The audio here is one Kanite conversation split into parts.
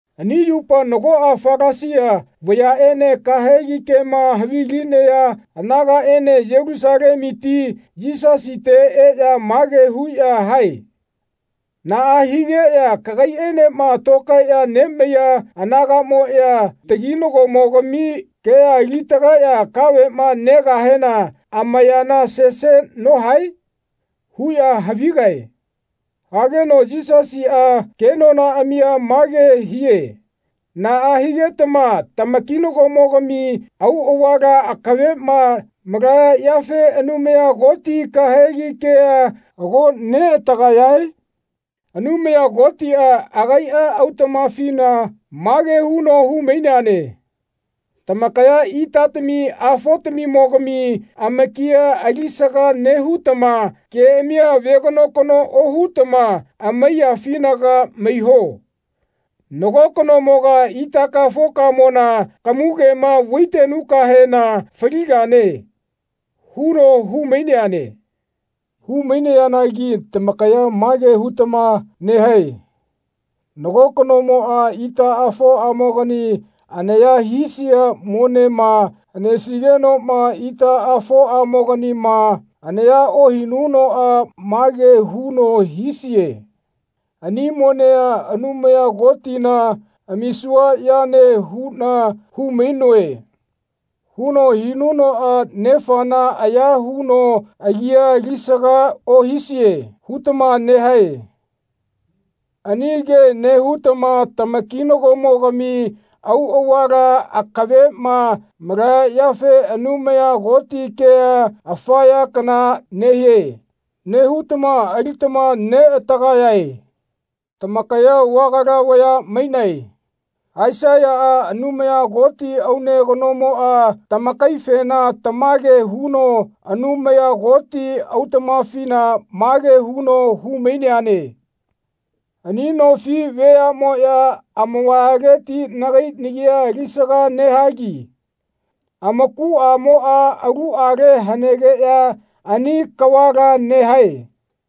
Ani yupa nagoꞌa Falasia vayaꞌene kahegi kema havilinaya anagaꞌene Yelusalemuti Yisasite eꞌya mage huꞌya hae “Naꞌa higeꞌya kagaiꞌenema tokaeꞌya nemaiya anagaꞌmoꞌya taginagomogami kea ali-tagaeꞌya kaveꞌma negahena amayana sese nohae?” huꞌya havigae. Hageno Yisasiꞌa kenonaꞌamia mage hie Naꞌa higetama tamakinagomogami auꞌavala akaveꞌma malaya yafe Anumaya Koti kahegi kea ago neꞌatagayae? Anumaya Kotiꞌa agaiꞌa autaꞌmafina mage huno hu-maineane. “Tamakaya itatami afotamimogami amakia alisaga nehutama keꞌamia veganokano ohutama amaiyaꞌafinaga maiho. Nago kanomoga itakafokamona kamugema vaitenukahena faligane.” huno hu-maineane. Hu-maineanagi tamakaya mage hutama nehae “Nago kanomoꞌa itaꞌafoꞌamogani anaya hisia monema hanesigenoꞌma itaꞌafoꞌamoganima anaya ohinunoꞌa mage huno hisie ‘Ani monea Anumaya Kotina amisua yane huꞌna hu-mainoe.’ huno hinunoꞌa nefana aya huno agia alisaga ohisie.” hutama nehae. Ani ke nehutama tamakinagomogami auꞌavala akaveꞌma malaya yafe “Anumaya Koti kea afa ya kana nehie.” nehutama alitama neꞌatagayae. Tamakaya vagala vaya mainae. Aisaiyaꞌa Anumaya Koti aune kanomoꞌa tamakaifena tamage huno Anumaya Koti autaꞌmafina mage huno hu-maineane “Ani nofi veaꞌmoꞌya amavayaleti nagai nagia alisaga nehagi amakuꞌamoꞌa aluꞌale hanegeꞌya ani kavala nehae.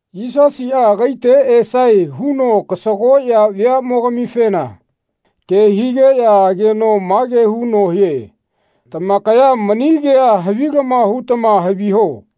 Yisasiꞌa agaite esae huno kasagoꞌya veaꞌmogamifena ke higeꞌya ageno mage huno hie “Tamakaya mani kea havilama hutama haviho.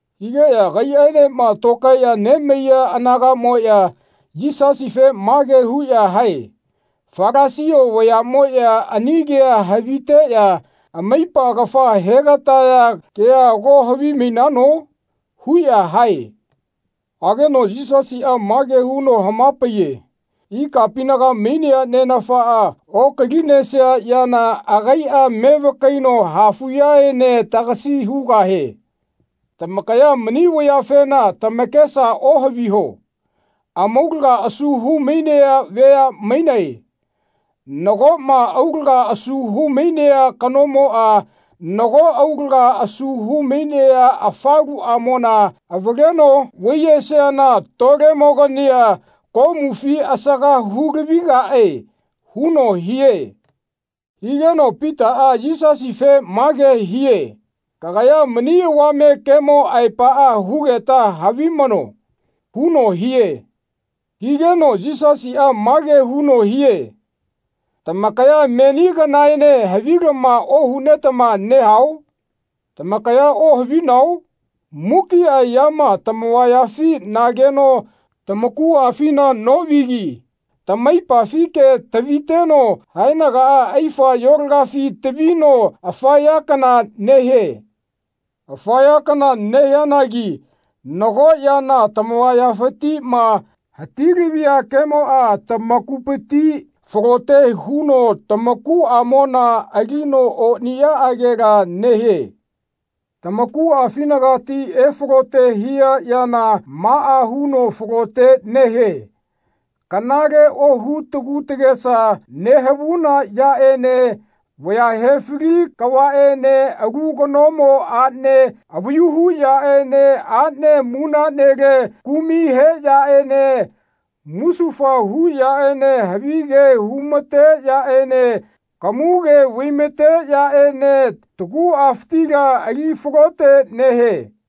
Higeꞌya agaiꞌaenema tokaeꞌya nemaiya anagaꞌmoꞌya Yisasife mage huꞌya hae “Falasia vayaꞌmoꞌya ani kea haviteꞌya amaipa kafa he-gataya kea ago havimainano?” huꞌya hae. Hageno Yisasiꞌa mage huno hama-paiye “Ikapinaga mainea Nenafaꞌa okalinesia yana agaiꞌa mevakaino hafuꞌyaene tagasi hugahie. Tamakaya mani vayafena tamakesa ohaviho. Amaulaga asu hu-mainea vaya mainae. Nagoꞌma aulaga asu hu-mainea kanomoꞌa nago aulaga asu hu-mainea afaluꞌamona avaleno vaiyesiana tolemogania komufi asaga hu-lavigaꞌe.” huno hie. Higeno Pitaꞌa Yisasife mage hie “Kagaya mani avame kemo aepaꞌa hugeta havimano.” huno hie. Higeno Yisasiꞌa mage huno hie “Tamakaya meni kanaene havilama ohunetama nehao? Tamakaya ohavinao? Mukiꞌa yama tamavayafi nageno tamakuꞌafina oꞌunogi tamaipafike taviteno haenagaꞌa aifayolagafi tavino afa ya kana nehie. Afa ya kana nehianagi nago yana tamavayafitiꞌma hati-lavia kemoꞌa tamakupiti falote huno tamakuꞌamona alino oniꞌyaꞌagela nehie. Tamakuꞌafinagati efalote hia yana maꞌa huno falote nehie kanale ohu tagu tagesa nehavuna yaꞌene vaya he-fali kavaꞌene alu kanomo aꞌne avayu hu yaꞌene aꞌne munaꞌnele kumai he yaꞌene musufaya hu yaꞌene havige hu-ma-te yaꞌene kamuge vai-ma-te yaꞌene taguꞌafitila ali falote nehie.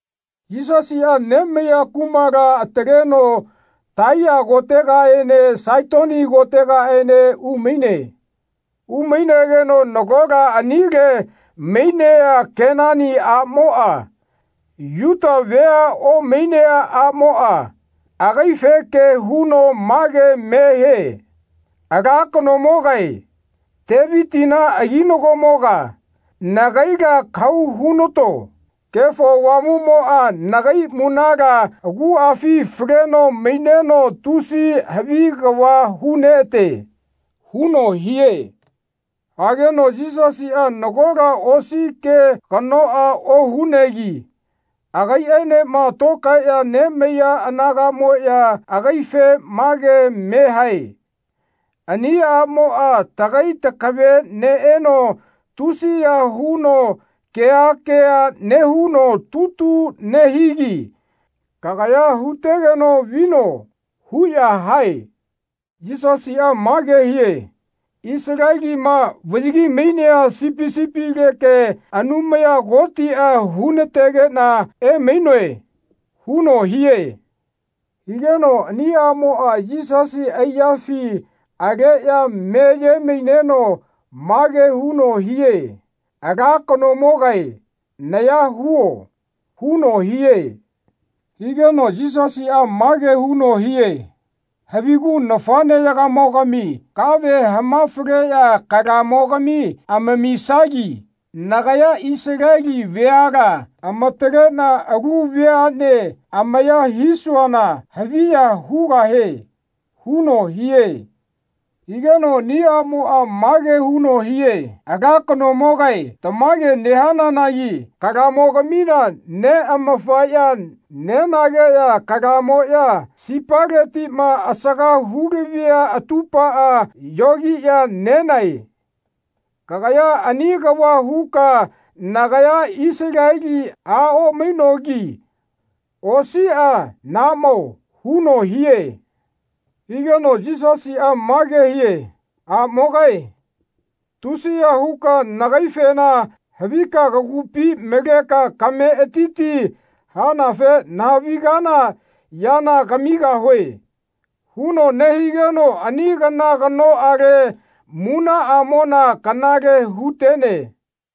Yisasiꞌa nemaiya kumala ataleno Taiya kotegaene Saitoni kotegaene umaine. Umainegeno nagola anile mainea Kenani aꞌmoꞌa, Yuta vea omainea aꞌmoꞌa, agaife ke huno mage me hie “Ala kanomogae, Tevitina aginagomoga, nagaila kahau hunato. Kefo Avamuꞌmoꞌa nagai munala aguꞌafi faleno maineno tusi havi kava hu-neꞌa-te.” huno hie. Higeno Yisasiꞌa nagola osi ke kanoꞌa ohunegi agaiꞌaenema tokaeꞌya nemaiya anagaꞌmoꞌya agaife mage me hae “Ani aꞌmoꞌa tagai takave neꞌeno tusiya huno keha keha nehuno tutu nehigi kagaya hu-tegeno vino.” huꞌya hae. Yisasiꞌa mage hie “Isalelima vaꞌyagi-mainea sipi sipileke Anumaya Kotiꞌa hu-na-tegeꞌna emainoe.” huno hie. Higeno ani aꞌmoꞌa Yisasi aiyafi aleꞌya meye-maineno mage huno hie “Ala kanomogae naya huo.” huno hie. Higeno Yisasiꞌa mage huno hie “Havigu nafaꞌneyagamogami kave hama-faleꞌya kalamogami amamisagi nagaya Isaleli veala amataleꞌna alu vayaꞌne amaya hisuana haviya hugahie.” huno hie. Higeno ani aꞌmoꞌa mage huno hie “Ala kanomogae tamage nehananagi kalamogamina neꞌamafaꞌya nenageꞌya kalamoꞌya sipaletiꞌma asaga hu-lavia atupaꞌa yogiꞌya nenae. Kagaya ani kava huka nagaya Isaleli a omainogi osiꞌa nahaꞌmao.” huno hie. Higeno Yisasiꞌa mage hie “Aꞌmogae tusiya huka nagaifena havika kagupi maleka kametiti hanafe nahavigana yana kamigahue.” huno nehigeno ani kana kanoꞌale munaꞌamona kanale hu-tene.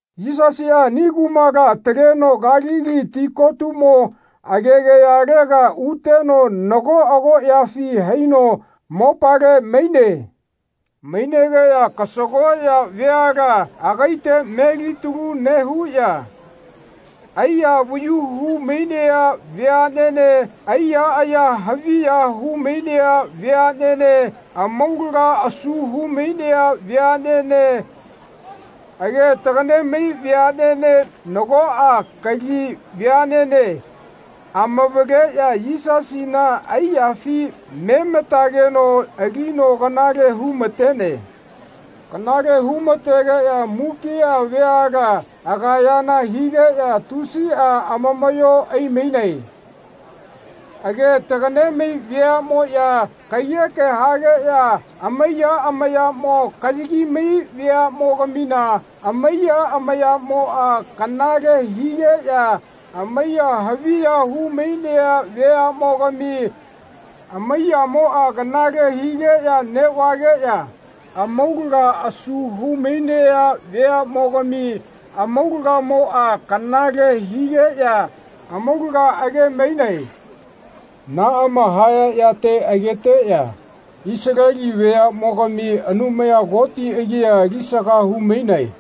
Yisasiꞌa ani kumala ataleno Kalili ti kotumo agegayalega uteno nago agoꞌyafi haino mopale maine. Mainegeꞌya kasagoꞌya veala agaite melitalu nehuꞌya aiya avayu hu-mainea veaꞌnene aiya aya haviya hu-mainea veaꞌnene amaulaga asu hu-mainea veaꞌnene age tagaꞌne-mai veaꞌnene nagoꞌa kali veaꞌnene amavaleꞌya Yisasina aiyafi mematageno alino kanale hu-ma-tene. Kanale hu-ma-tegeꞌya mukiꞌa veala agayana higeꞌya tusiꞌa amamaꞌyo ai-mainae. Age tagaꞌne-mai veaꞌmoꞌya kaiyeke hageꞌya amaiya amayamo kayagi-mai veaꞌmogamina amaiya amayaꞌmoꞌa kanale higeꞌya amaiya haviya hu-mainea veaꞌmogami amaiyamoꞌa kanale higeꞌya neꞌvageꞌya amaulaga asu hu-mainea veaꞌmogami amaulagamoꞌa kanale higeꞌya amaulaga age-mainae. Naꞌama haya yate ageteꞌya Isaleli veaꞌmogami Anumaya Koti agia alisaga hu-mainae.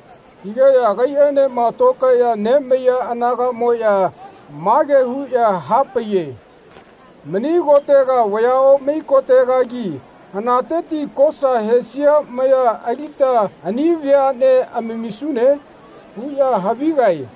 Higeꞌya agaiꞌaenema tokaeꞌya nemaiya anagaꞌmoꞌya mage huꞌya hapaiye “Mani kotega vaya omai kotegagi hanateti kosa hesia maya alita ani veaꞌnea amamisune?” huꞌya havigae.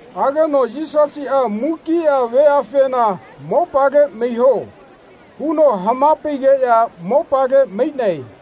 Hageno Yisasiꞌa mukiꞌa veafena “Mopale maiho.” huno hama-paigeꞌya mopale mainae.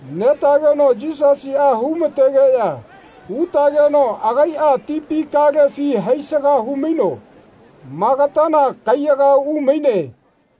Netageno Yisasiꞌa hu-mategeꞌya utageno agaiꞌa tipi kalefi haisaga hu-maino Magatana kaiyaga umaine.